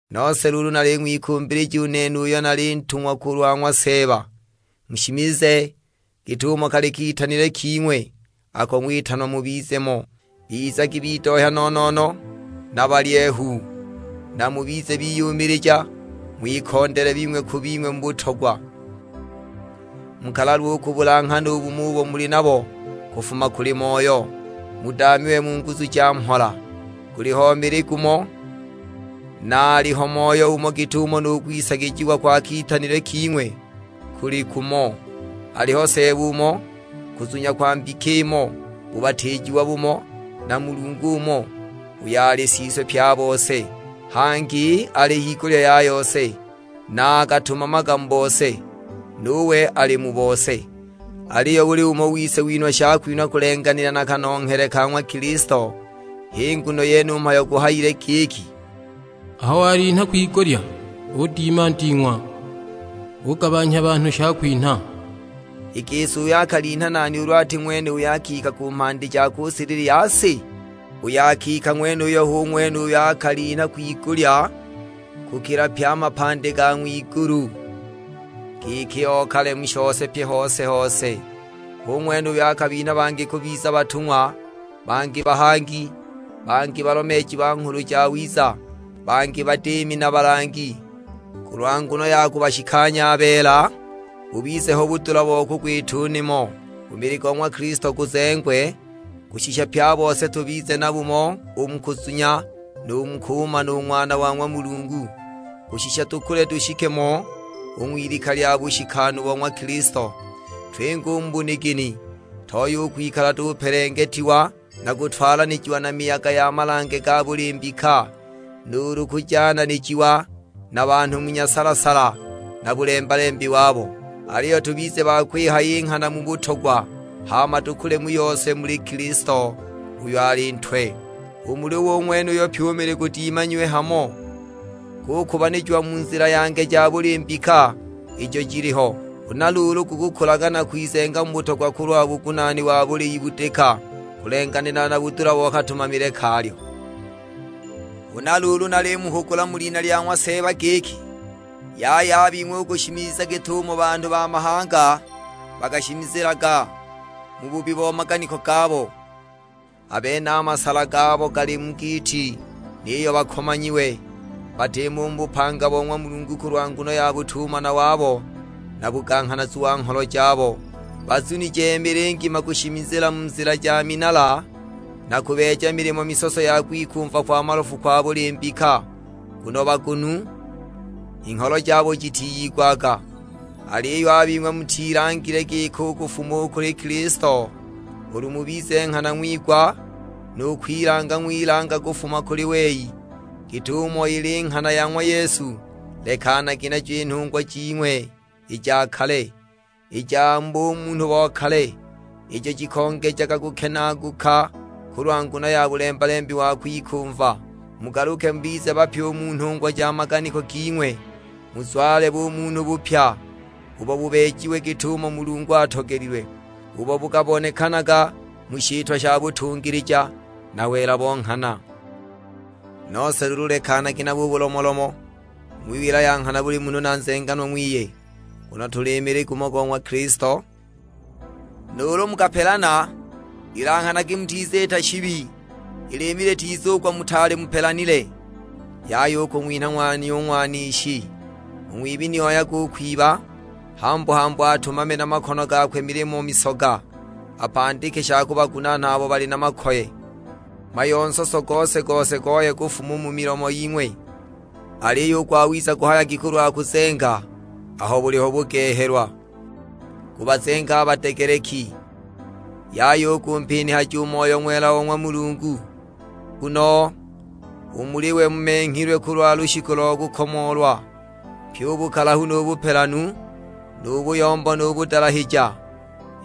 Nose luulu naling'wikumbilija u nene uyo nali ntungwa kulwa ng'wa Seeba, mushimize git'umo kali kitanilwe king'we ako ng'witanwa mubize mo. Bizagi bidohya no-no-no na balyehu, na mubize biyumilija; ng'wikondele bing'we ku bing'we mu butogwa. Mukalalwe u kubulanghana u bumo ubo muli nabo kufuma kuli Moyo, budaamiwe mu nguzu ja mhola. Guliho mili gumo, na aliho Moyo umo git'umo nu kwisagijiwa kwa kitanilwe king'we kuli kumo. Aliho Seeba umo, kuzunya kwa mbika imo, bubatiijiwa bumo; na Mulungu umo, uyo ali Siswe pye a bose, hangi ali higulya ya yose, na akatumamaga mu bose, nuwe ali mu bose. Aliyo buli umo wise winhwa shakwinhwa kulenganila na kanonghele ka ng'wa Kilisto. H'i nguno yene u mhayo guhayile giki, "Aho walinha kwigulya udima nding'wa, ugabanhya banhu shakwinha." (I gisi uyo akalinha, nani ulu ati ng'wene uyo akika ku mhandi ja ku silili ya si? Uyo akika ng'wenuyo hu ng'wene uyo akalinha kwigulya kukila pye a mapandi ga ng'wigulu, giki okale mu shose pye hose-hose). Hu ng'wene uyo bangi akabinha kubiza batung'wa, bangi bahangi, bangi balomeeji ba Nghulu Jawiza, bangi badiimi na balangi, kulwa nguno ya kubashikanya a beela, bubize ho budula bo kugwita u nimo, u mili go ng'wa Kilisto guzengwe. Kushisha pye a bose tubize na bumo u mu kuzunya, nu mu kumana u Ng'wana wa ng'wa Mulungu; kushisha tukule tushike mo u ng'wilika lya bushikanu bo ng'wa Kilisto. Twinge u mu bunigini, tooye u kwikala tupelengetiwa na kutwalanijiwa na miyaga ya malange ga buli mbika, nuulu kujananijiwa na banhu mu nyasala-sala na bulemba-lembi wabo. Aliyo tubize ba kwihaya i nghana mu butogwa, hama tukule mu yose u muli Kilisto uyo ali Ntwe. U muli we u ng'wenuyo pyi u mili gudimanyiwe hamo, gukubanijiwa mu nzila ya nge ja buli mbika ijo jiliho. Huna luulu gukukulaga na kwizenga mu butogwa kulwa bugunaani wa buli ibudika, kulenganila na budula bo katumamile kalyo. Huna luulu nalimuhugula mu lina lya ng'wa Seeba giki, yaya a bing'we u kushimiza git'umo banhu ba mahanga bakashimizilaga; mu bubi bo maganiko gabo. A bene a masala gabo gali mu giiti, niyo bakomanyiwe, batimo u mu bupanga bo ng'wa Mulungu kulwa nguno ya butumana wabo na buganghanazu wa ngholo jabo! Bazunije mili ngima kushimizila mu nzila ja minala, na kubeeja milimo misoso ya kwikumva kwa malofu kwa buli mbika; nguno bagunu, i ngholo jabo jitiyigwaga! Aliyo a bing'we mutilangile giko u kufuma u kuli Kilisto, ulu mubize nghana ng'wigwa, nu kwilanga ng'wilanga kufuma kuli wei, git'umo ili i nghana ya ng'wa Yesu. Lekanagi najo i nhungwa jing'we i ja kale, i ja mu bumunhu bo kale, ijo jikongejaga kukenaaguka kulwa nguno ya bulemba-lembi wa kwikumva; Mugaluke mubize bapya u mu nhungwa ja maganiko ging'we, muzwale bumunhu bupya, ubo bubeejiwe git'umo Mulungu atogelilwe; ubo bukabonekanaga mu shitwa sha butungilija na wela bo nghana. Nose luulu lekanagi nabo u bulomolomo, ng'wiwila ya nghana buli munhu na nzenganwa ng'wiye, nguno tuli mili gumo go ng'wa Kilisto. Nuulu mukapelana, ilanghanagi mutiziita shibi; i liimi litizugwa mutaali mupelanile. Yaya u kung'winha ng'wanya u Ng'wanishi. U ng'wibi ni oyage u kwiba, hambu-hambu atumame na makono gakwe milimo misoga, apandike sha kubagunaana abo bali na makoye. Mhayo nsoso gose-gose gooye kufuma u mu milomo ying'we, aliyo u gwawiza guhayagi kulwa kuzenga aho buliho bugehelwa, gubazenge a badegeleki. Yaya u kumpinihaja u Moyo Ng'wela o ng'wa Mulungu, nguno u muli we mumenghilwe kulwa lushiku lo kukomoolwa. Pye u bukalahu nu bupelanu, nu buyombo nu budalahija,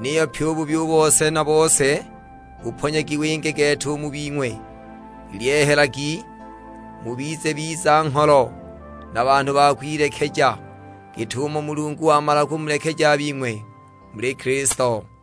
niyo pyi u bubi bose na bose buponyagi winge gete u mu bing'we. Ilyehelagi, mubize biza-ngholo na banhu ba kwilekeja, git'umo Mulungu wamala kumulekeja a bing'we muli Kilisto.